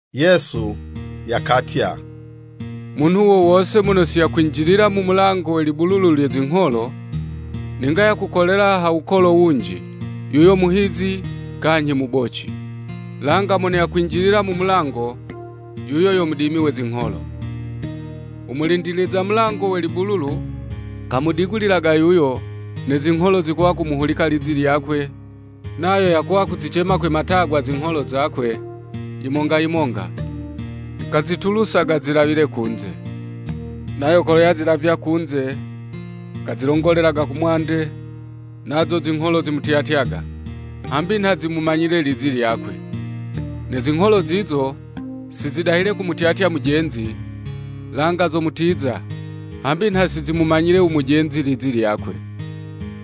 Yesu yakatya, “Munhu wo wose mono si yakwinjilila mu mulango we libululu lye zingholo, ninga yakukolela ha wukolo wunji, yuyo muhizi, kanyhi muboci. Langa mono yakwinjilila mu mulango, yuyo yo mudimi we zingholo. U mulindiliza mulango we libululu, kamudigulilaga yuyo, ne zingholo zikuwa kumuhulika lizi lyakwe, nayo yakuwa kuzicema kwe matagwa zingholo zakwe, yimonga yimonga, kazitulusaga zilawile kunze. Nayo kolo yazilavya kunze, kazilongolelaga ku mwande, nazo zingholo zimutyatyaga, hambi nha zimumanyile lizi lyakwe. Ne zingholo zizo, si zidahile kumutyatya mujenzi, langa zomutiza, hambi nha si zimumanyile u mujenzi lizi lyakwe.”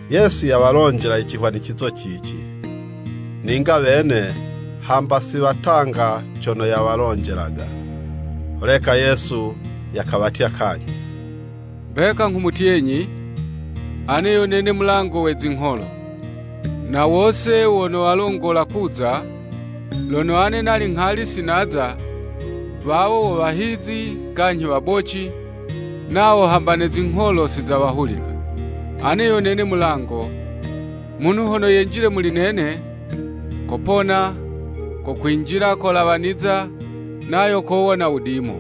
Yesu yawalonjela i cihwanicizo cici, ninga wene hamba si watanga cono yawalonjelaga. Holeka Yesu yakawatya kanyhi, “Mbeka nghumutyenyi, Ane yo nene mulango we zingholo. Na wose wono walongola kuza, lono ane nali nghali si naza, wawo wo wahizi, kanyhi waboci, nawo hamba ne zingholo si zawahulika. Ane yo nene mulango, munhu hono yenjilile muli nene, kopona, kokwinjila kolawaniza, nayo kowona wudimo.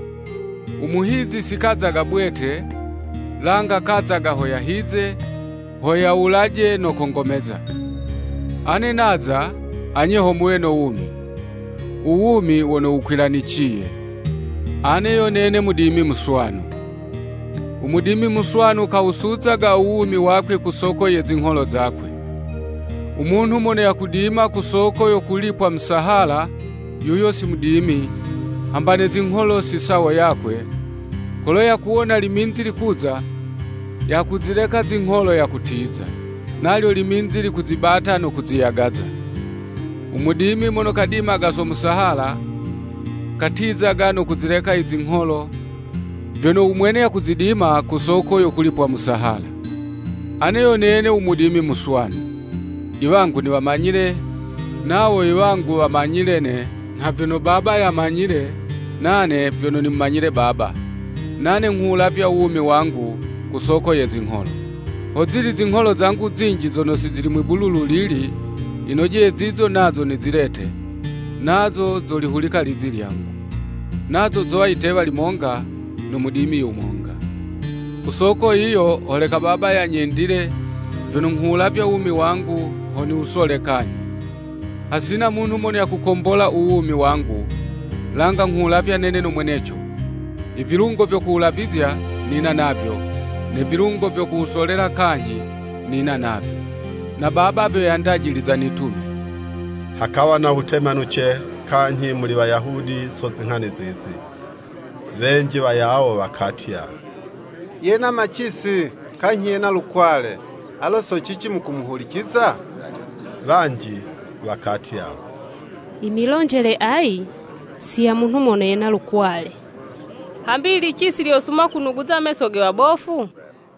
U muhizi si kazaga bwete, langa kazaga ho yahize, ho yawulaje no kongomeza. Ane naza, anye ho muwe no wumi. U wumi wono wukwilaniciye.” Ane yo nene mudimi muswanu. U mudimi muswanu, kawusuzaga u wumi wakwe ku soko ye zingholo zakwe. U munhu mono yakudima ku soko yo kulipwa musahala, yuyo si mudimi, hamba ne zingholo si sawo yakwe, kolo yakuwona liminzi likuza, yakuzileka zingholo, yakutiza. Nalyo liminzi likuzibata no kuziyagaza. U mudimi mono kadimaga so musahala, katizaga no kuzileka i zingholo, vyono u mwene yakuzidima ku soko yo kulipwa musahala. Ane yo nene u mudimi muswanu. Iwangu niwamanyile, nawo iwangu, wamanyile'ne, nha vyono Baba yamanyile, nane vyono nimumanyile Baba. Nane nghuwulavya u wumi wangu, ku soko ye zingholo. Hozili zingholo zangu zinji zono si zili mwi'bululu lili, yinojeye zizo nazo nizilete; Nazo zolihulika ilizi lyangu. Nazo zowa yitewa limonga no mudimi yumonga. “Ku soko yiyo holeka Baba yanyendile, vyono nghuwulavya u wumi wangu, ho niwusole kanyhi. Hasina munhu mono yakumboka u wumi wangu, langa nghuwulavya nene no mweneco. I vilungo vyo kuwulavizya, nina navyo, ne vilungo vyo kuwusolela kanyhi, nina navyo. Na Baba vyo yandajiliza nitume.” Hakawa na witemanuce kanyhi muli Wayahudi so zinghani zizi. Wenji wayawo wakatya, “Yena macisi, kanyhi yena lukwale, alo so cici mukumuhuliciza?” Wanji wakatya, “I milonjele ayi, si ya munhu mono yena lukwale, hambi i licisi lyosuma kunuguza meso ge wabofu?”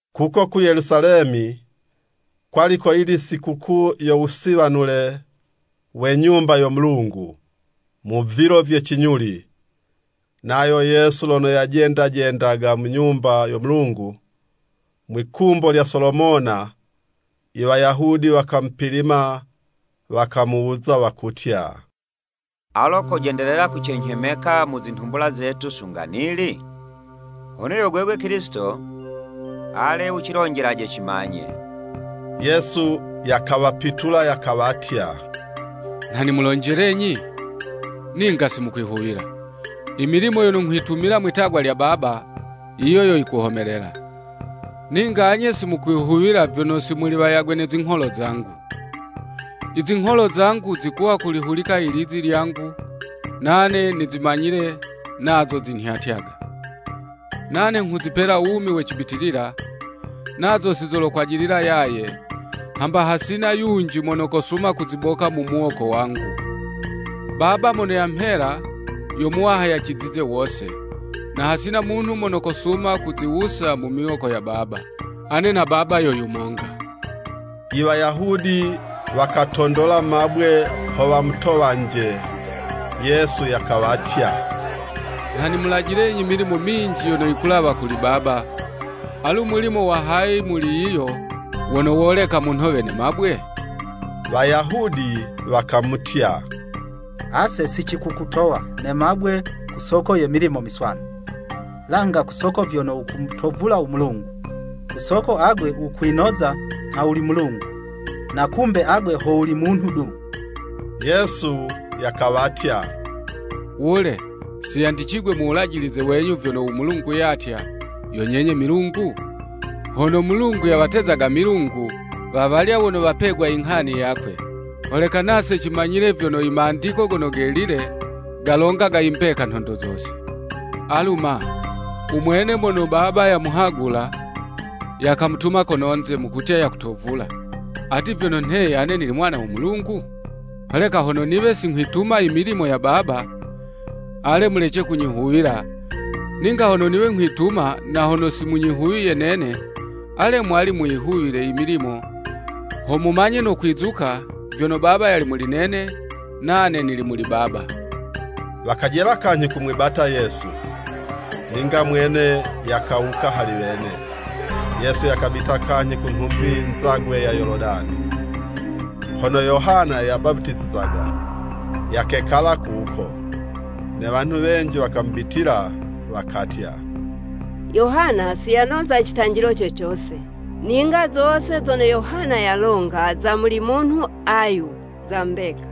Kuko ku Yelusalemi, kwali koyili Sikukuu yo Wusiwanule we Nyumba yo Mulungu, mu vilo vye cinyuli. Nayo Yesu lono yajendajendaga mu Nyumba yo Mulungu, mwi'kumbo lya Solomona. Iwayahudi wakamupilima, wakamuwuza wakutya, “Alo kojendelela kucenyhemeka mu zinhumbula zetu sunga nili? Hono yo gwegwe Kilisito, ale wucilonjelaje cimanye.” Yesu yakawapitula, yakawatya, “Nha nimulonjelenyi, ninga si mukwihuwila. I milimo yono nghwitumila mwitagwa lya Baba, yiyo yo yikuhomelela. Ninga anye si mukwihuwila, vyono si muli wayagwe ne zingholo zangu. Izingholo zangu zikuwa kulihulika ilizi lyangu, nane nizimanyile, nazo zinhyatyaga. Nane nghuzipela wumi we cibitilila, nazo si zolokwajilila yaye, hamba hasina yunji mono kosuma kuziboka mu muwoko wangu. Baba mono yamhela, yo Muwaha yacizize wose, na hasina munhu mono kosuma kuziwusa mu miwoko ya Baba. Ane na Baba yo monga.” Iwayahudi wakatondola mabwe ho wamutowanje. Yesu yakawatya, “Nha nimulajilenyi milimo minji yono yikulawa kuli Baba, alu mulimo wa hayi muli yiyo, wono woleka munhowe ne mabwe?” Wayahudi wakamutya, “Ase si cikukutowa ne mabwe ku soko ye milimo miswanu, langa ku soko vyono wukumutovula u Mulungu! Ku soko agwe wukwinoza nha wuli Mulungu, na kumbe agwe ho wuli munhu du.” Yesu yakawatya, “Wule, si yandicigwe mu Wulajilize wenyu vyono u Mulungu yatya, ‘Yo nyenye milungu?’ Hono Mulungu yawatezaga milungu, wawalya wono wapegwa i nghani yakwe, holeka nase cimanyile vyono, Imandiko Gono Gelile, galongaga imbeka nhondo zose. Alu ma, u mwene mono Baba yamuhagula, yakamutuma kononze, mukumutya yakutovula, ati vyono nheye, ‘Ane nili Mwana wo Mulungu?’ Holeka hono niwe si nghwituma i milimo ya Baba, ale mulece kunyihuwila, ninga hono niwe nghwituma na hono si munyihuwiye nene, ale mwali muyihuwile i milimo, ho mumanye no kwizuka vyono Baba yali muli nene, nane nili muli Baba.” Wakajela kanyhi kumwibata Yesu, ninga mwene yakawuka hali wene. Yesu yakabita kanyhi ku nhumbi nzagwe ya Yoludani, hono Yohana yabaputizizaga, yakekala kuko. Ne wanhu wenji wakamubitila, wakatya, “Yohana si yanoza citanjilo co cose. Ninga zose zono Yohana yalonga za muli munhu ayu, za mbeka.”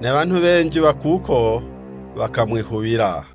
Ne wanhu wenji wa kuko wakamwihuwila.